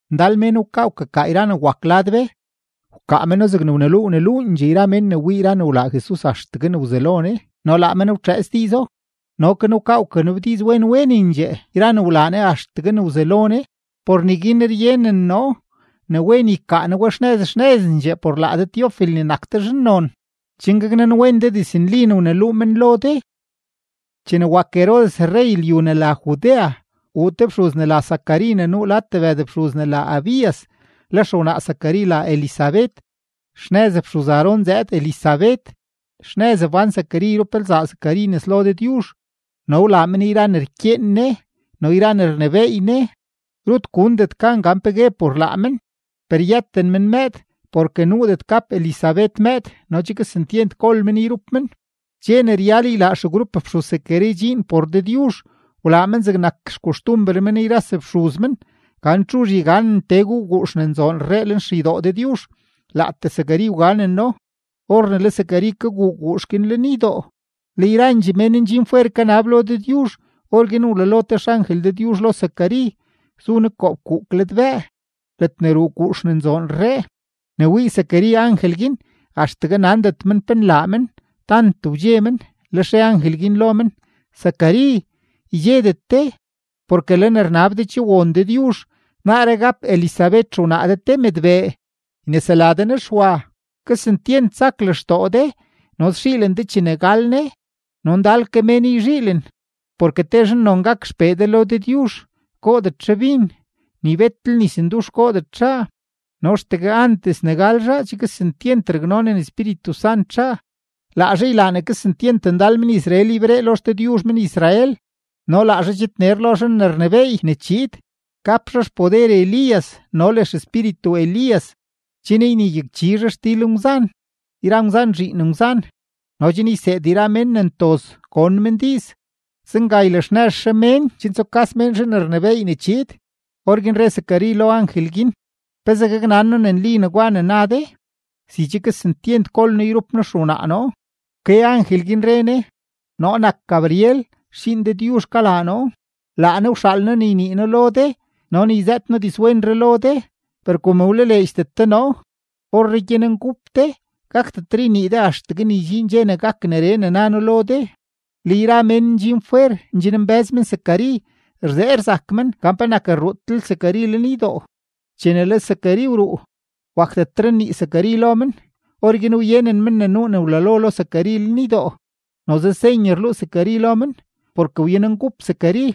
Ndal mén wkaa wkakaa yra ne wak lad be; wkaa meno zegne wneluu wneluundxee yra mén ne wii yra ne wlaa Jesus axtegue ne wzelo Ne no laa men wtxëëts diizo. No ke noo wkaa wkanabdiiz wen wenendxee yra ne wlaa Ne axtegue ne wzelo Ne. Por neguin ryenen noo ne wen ykaa noo we xnëz xnëzendxee por laa de Teofil ne nak de zhannon, chen gaknanwen de diznli ne wneluu men lo de. Chene wak Herodes rrey lyu ne la Judea, wuu te fxuz ne la Zacari ne nuu lad tebëd fxuz ne la Abías; le lzaa Zacari la Elisabet, xnëz fxuz-Aarón zëëd Elisabet. Xnëz wbán Zacari yrup lzaa Zacari nes lo Dëdyuzh no wlaa men yra ne rkyeen Ne no yra ne rnebééy Ne. Rut gundet gan pe gue por laa men. Per yëten men mëëd porke nuudet gap Elisabet mëëd no che kesentyent gol men yrup men. Dxe ne ryal ylaa xegrup fxuz-Zacari dxiin por Dëdyuzh, wlaa men zegnak xkoxtumber men yra sefxuz men, gan txuzh yganen tee guu guux ne nzoon rree lenxeydoo Dëdyuzh. Laatee Zacari wganeno. Or ne le Zacari kaguu guux guin lenydoo, le yrandxee mén ndxin fwer kanab lo Dëdyuzh. Orguin wlalo te xangel Dëdyuzh lo Zacari; zu ne koo fkuuk ladbëë, ledne ruu guux ne nzoon rree. Ne wii Zacari angel guin, axtegue nandet men pe nlaa men, tant wdxe men. Lex re angel guin lo men: ―Zacari, ydxedet de, porke le ne rnab de che won Dëdyuzh; naaree gap Elisabet xewnaa de te mëdbee, ynesela de ne Xwa. Kesentyent sak lextoo de no szhiilen de chene gal ne, no ndal ke mén yzhiilen, porke te zhannon gak xpee de lo Dëdyuzh. Goodet zhaa bin, ni betlel nisndux goodet zhaa, no axtegue antes ne gal zhaa, che kesentyent raknonen Espíritu Sant zhaa. Laa zhaa ylaa ne kesentyent ndal men-Israel yberee lo XDëdyuzh men-Israel. No laa zhaa chidner lo Zhan ne rnebééy ne chiid. Gap zhaa xpoder Elías no le xespíritu Elías, chen ynegyakchi zhaa xdil ngwzan yra ngwzan zhiin ngwzan no chen yseed yra mén ne ntoz gon men diiz. Zenga ylaxnëz zhaa mén chen tsukas mén Zhan ne rnebééy ne chiid. Orguin re Zacari lo angel guin: ―¿Pezee gaknan noo ne nli negwa ne na de? Si che kesentyent gol noo yrup noo xewnaa noo. Wke angel guin, re ne: ―Noo nak Gabriel, xdxiin Dëdyuzh kalaa noo; laa Ne wxaal noo ne ynii noo lo de no ne yzëët noo dizwenree lo de. Per kom wlaleedxdet de noo, orree gyanengup de, gakdet ynii de axtegue ne ydxiin dxe ne gak neree ne na noo lo de. Le yra mén ndxin fwer ndxinmbë́z men Zacari, rzee rzak men gan penak rruudetlel Zacari lenydoo. Chene le Zacari wruu, wakdetre nnii Zacari lo men. Orguin wyenen men ne nuu ne wlalo lo Zacari lenydoo. Noze senye rluu Zacari lo men, porke wyanengup Zacari.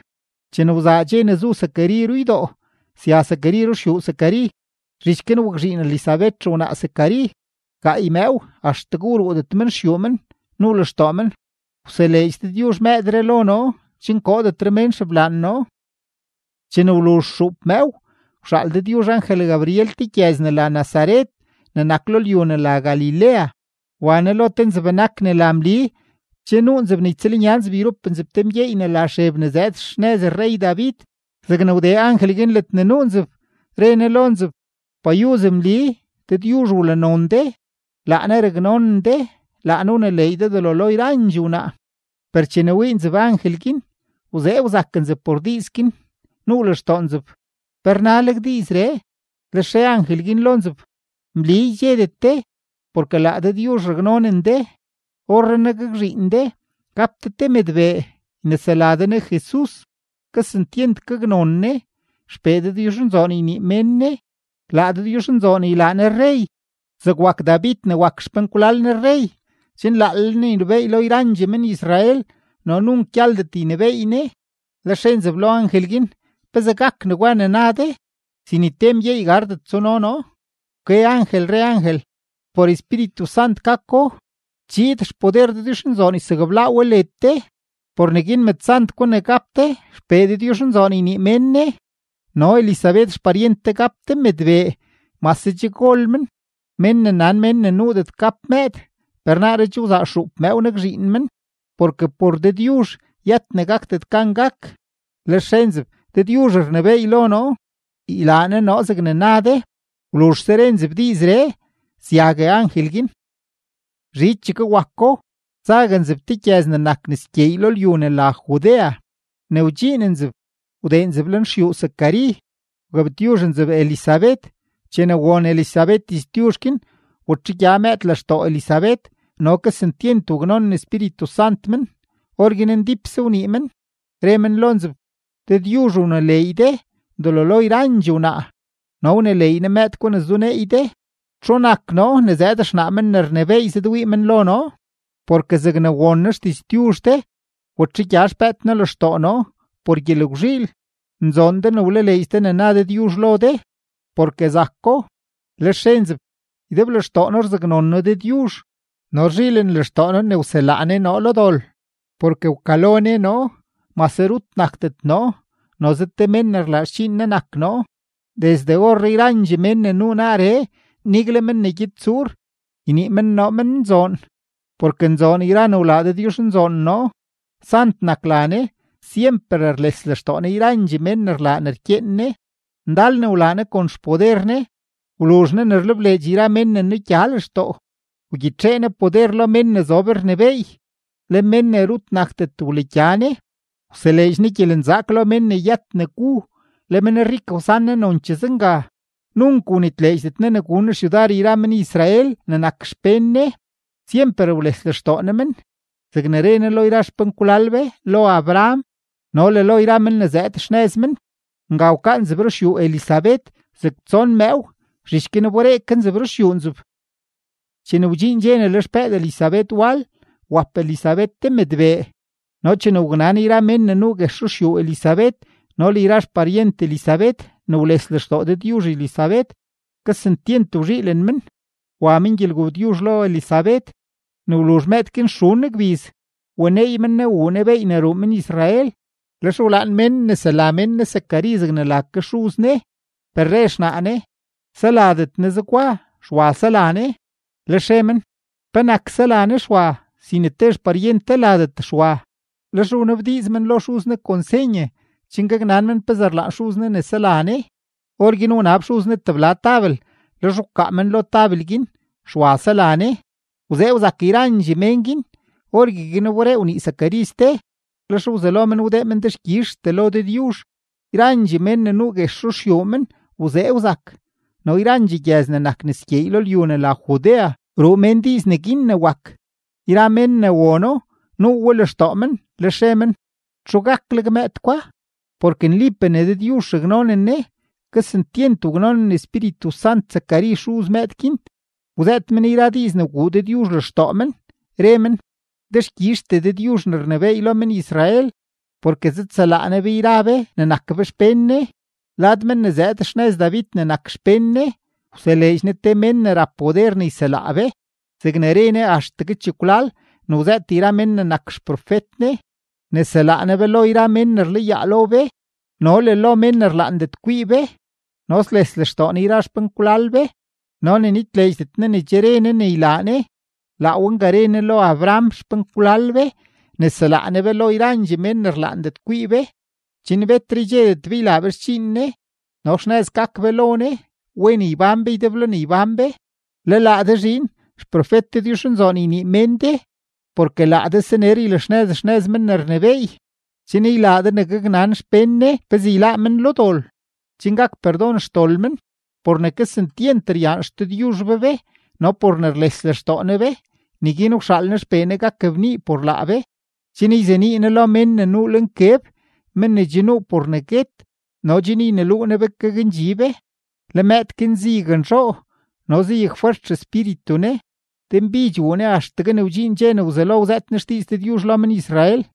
Chene wzaa dxe ne zu Zacari ruydoo, sya Zacari ruxyuu Zacari. Zhich guin wakzhiin Elisabet xewnaa Zacari. Gaay mëëw axtegue wruudet men xyuu men, nuu lextoo men: “Wseleedx Dëdyuzh mëëdree lo noo chen koodetre mén xeblaan noo.” Chene wluzh xuup mëëw, wxaal Dëdyuzh angel-Gabriel te gyëz ne la Nazaret ne nak lo lyu ne la Galilea; wa ne lo te nzeb-benak ne la Mli. Che nuu nzeb ne ytsëlnya nzeb yrup nzeb te mgyeey ne la Xeb ne zëëd xnëz rrey-David. Zegne wdee angel guin ledne nuu nzeb, re ne lo nzeb: ―¡Payuz, Mli! Dëdyuzh wlanon de; laa Ne raknonen de; laa Ne wneleey de delo lo yrandxee wnaa. Per chene wii nzeb angel guin, wzee wzak nzeb por diiz guin, nuu lextoo nzeb pe rnaleg diizree. Lex re angel guin lo nzeb: ―Mli, ydxedet de, porke laa Dëdyuzh raknonen de. Orrenaa gakzhiin de; gap de te mëdbee, ynesela de ne JESUS. Kesentyent gaknon ne; XPee Dëdyuzhnzoon ynii mén ne; laa Dëdyuzhnzoon ylaa ne rrey zeg wak David ne nak xpenkwlal ne rrey, chen laalel ne ynebééy lo yrandxee men-Israel, no nunk gyaldet ynebééy ne. Lex re nzeb lo angel guin: ―¿Pezee gak negwa ne na de, si ni te mgyeey gardet tsuno noo? Wke angel re angel: ―Por Espíritu Sant gako; chiid xpoder Dëdyuzhnzoon ysakblaa we led de; por neguin mëdsant gwa ne gap de, XPee Dëdyuzhnzoon ynii mén ne. No Elisabet xparyent de gap te mëdbee mase che gol men, men ne nan mén ne nuudet gap mëëd, per naaree wzaa xuup mëëw nakzhiin men. Porke por Dëdyuzh yët ne gakdet gan gak. Lex re nzeb: ―Dëdyuzh rnebééy lo noo; ylaa Ne noo zegne na de. Wluzhse re nzeb diizree, syague angel guin. Zhichegue wako, zague nzeb te gyëz ne nak nes gyeey lo lyu ne la Judea; ne wdxiin nzeb, wdee nzeb lenxyuu Zacari, wgabtyuzh nzeb Elisabet. Chene won Elisabet diztyuzh guin, watxegya mëëd lextoo Elisabet, no kesentyent waknonen Espíritu Sant men. Orguin ndípse wnii men, re men lo nzeb: ―Dëdyuzh wneleey de delo lo yrandxee wnaa, no wneleey Ne mëëd gwa ne zuneey de. ¿Txu nak noo ne zëëd xnaa Men ne rnebééy zëdwii men lo noo? Porke zegne won noo xdiztyuzh de, watxegya xpëëd noo lextoo noo por gyelgwzhiil. Nzoon de ne wlaleedx de ne na Dëdyuzh lo de, porke zako. Lex re nzeb: Ydeblextoo noo rzaknon noo Dëdyuzh, no rzhiilen lextoo noo ne wselaa Ne noo lo dol. Porke wkalo Ne noo, mase rut nakdet noo, noze te mén ne rlaa xdxiin Ne nak noo. Desde orree yrandxee mén ne nuu naaree, nigle mén ne gyed tsuur, ynii men noo men nzoon. Porke nzoon yra ne wlaa Dëdyuzhnzoon noo; sant nak la Ne. Syemper rles lextoo Ne yrandxee mén ne rlaa ne rkyeen Ne. Ndal ne wlaa Ne kon xpoder Ne; wluzh Ne ne rlebleedx yra mén ne nugya lextoo. Wgyitxee Ne poder lo mén ne zob rnebééy, le mén ne rut nakdet wlagya Ne. Wseleedx Ne gyelenzaak lo mén ne yët ne gu, le menrik wsan Ne nonchee zenga. Nunk wnitleedxdet Ne ne gun Ne xyudar yra men-Israel ne nak xpén Ne, syemper wles lextoo Ne men, zegne re Ne lo yra xpenkwlal be, lo Abraham no le lo yra men ne zëëd xnëz men. Nga wkaa nzeb ruxyuu Elisabet zeg tson mëëw, zhich guin wberee ke nzeb ruxyuu nzeb. Chene wdxiin dxe ne le xpëëd Elisabet wal, wap Elisabet te mëdbee. No chene waknan yra mén ne nuu guex ruxyuu Elisabet no le yra xparyent Elisabet ne wles lextoo Dëdyuzh Elisabet, kesentyent wzhiilen men; wa men gyelgabtyuzh lo Elisabet. Ne wluzh mëëd guin xun gbiz, waneey men ne wuu ne beey ne ruu men-Israel, lex wlaan mén nnesela mén ne Zacari zegne la ke xuz ne. Per re xnaa ne: ―Seladet ne zegwa, Xwa sela ne. Lex re men: ―¿Penak sela ne Xwa, si ni te xparyent de ladet Xwa? Lex wnabdiiz men lo xuz ne kon senye, chen gaknan men pezee rlaan xuz ne sela ne. Orguin wnab xuz ne tebla tabel, lex wkaa men lo tabel guin: “Xwa sela ne.” Wzee wzak yrandxee mén guin. Orgueguin wberee wnii Zacari ste, lex wzelo men wdee men dexkyizhtee lo Dëdyuzh. Yrandxee mén ne nuu guex ruxyuu men wzee wzak, no yrandxee gyëz ne nak nes gyeey lo lyu ne la Judea ruu mén diiz neguin ne wak. Yra mén ne wono, nuu we lextoo men, lex re men: ―¿Txu gakleg mëëd gwa? Porke nlipee ne Dëdyuzh raknonen ne. Kesentyent waknonen Espíritu Sant Zacari xuz mëëd guin; wzëët men yra diiz ne wguu Dëdyuzh lextoo men, re men: Dexkyizhtee Dëdyuzh ne rnebééy lo men-Israel, porke zëdselaa Ne be yra be ne nak be xpén Ne. Lad men ne zëëd xnëz David ne nak xpén Ne, wseleedx Ne te mén ne rap poder ne yselaa be. Zegne re Ne axtegue chekwlal ne wzëët yra men ne nak xprofet Ne, ne selaa Ne be lo yra mén ne rlayaa lo be no le lo mén ne rlaandet kwii be, no ne sles lextoo Ne yra xpenkwlal be, no ne nitleedxdet Ne ne che re Ne ne ylaa Ne. Laa we nga re Ne lo Abraham xpenkwlal be: ne selaa Ne be lo yra mén ne rlaandet kwii be, chen betre ydxedet be ylaa be xdxiin Ne, no xnëz gak be lo Ne, wen ybán be ydeblo ne ybán be. Le laa de zhiin, xprofet Dëdyuzhnzoon ynii mén de, porke laa de saner ylaxnëz xnëz Men ne rnebééy, chen ylaa de ne gaknan xpén Ne pezee yláá men lo dol, chen gak perdon xdol men. Por ne kesentyent ryaan XDëdyuzh be be no por ne rles lextoo Ne be, neguin wxaal Ne XPee Ne gak bnii por laa be, chen yzenii Ne lo mén ne nuu lo nkeb, men ne che nuu por guet no chen yneluu Ne be gakndxi be. Le mëëd guin zayaknzhoo no zayakfwert xespíritu ne; denbidx wuu ne axtegue ne wdxiin dxe ne wzelo wzëët ne xdiiz Dëdyuzh lo men-Israel.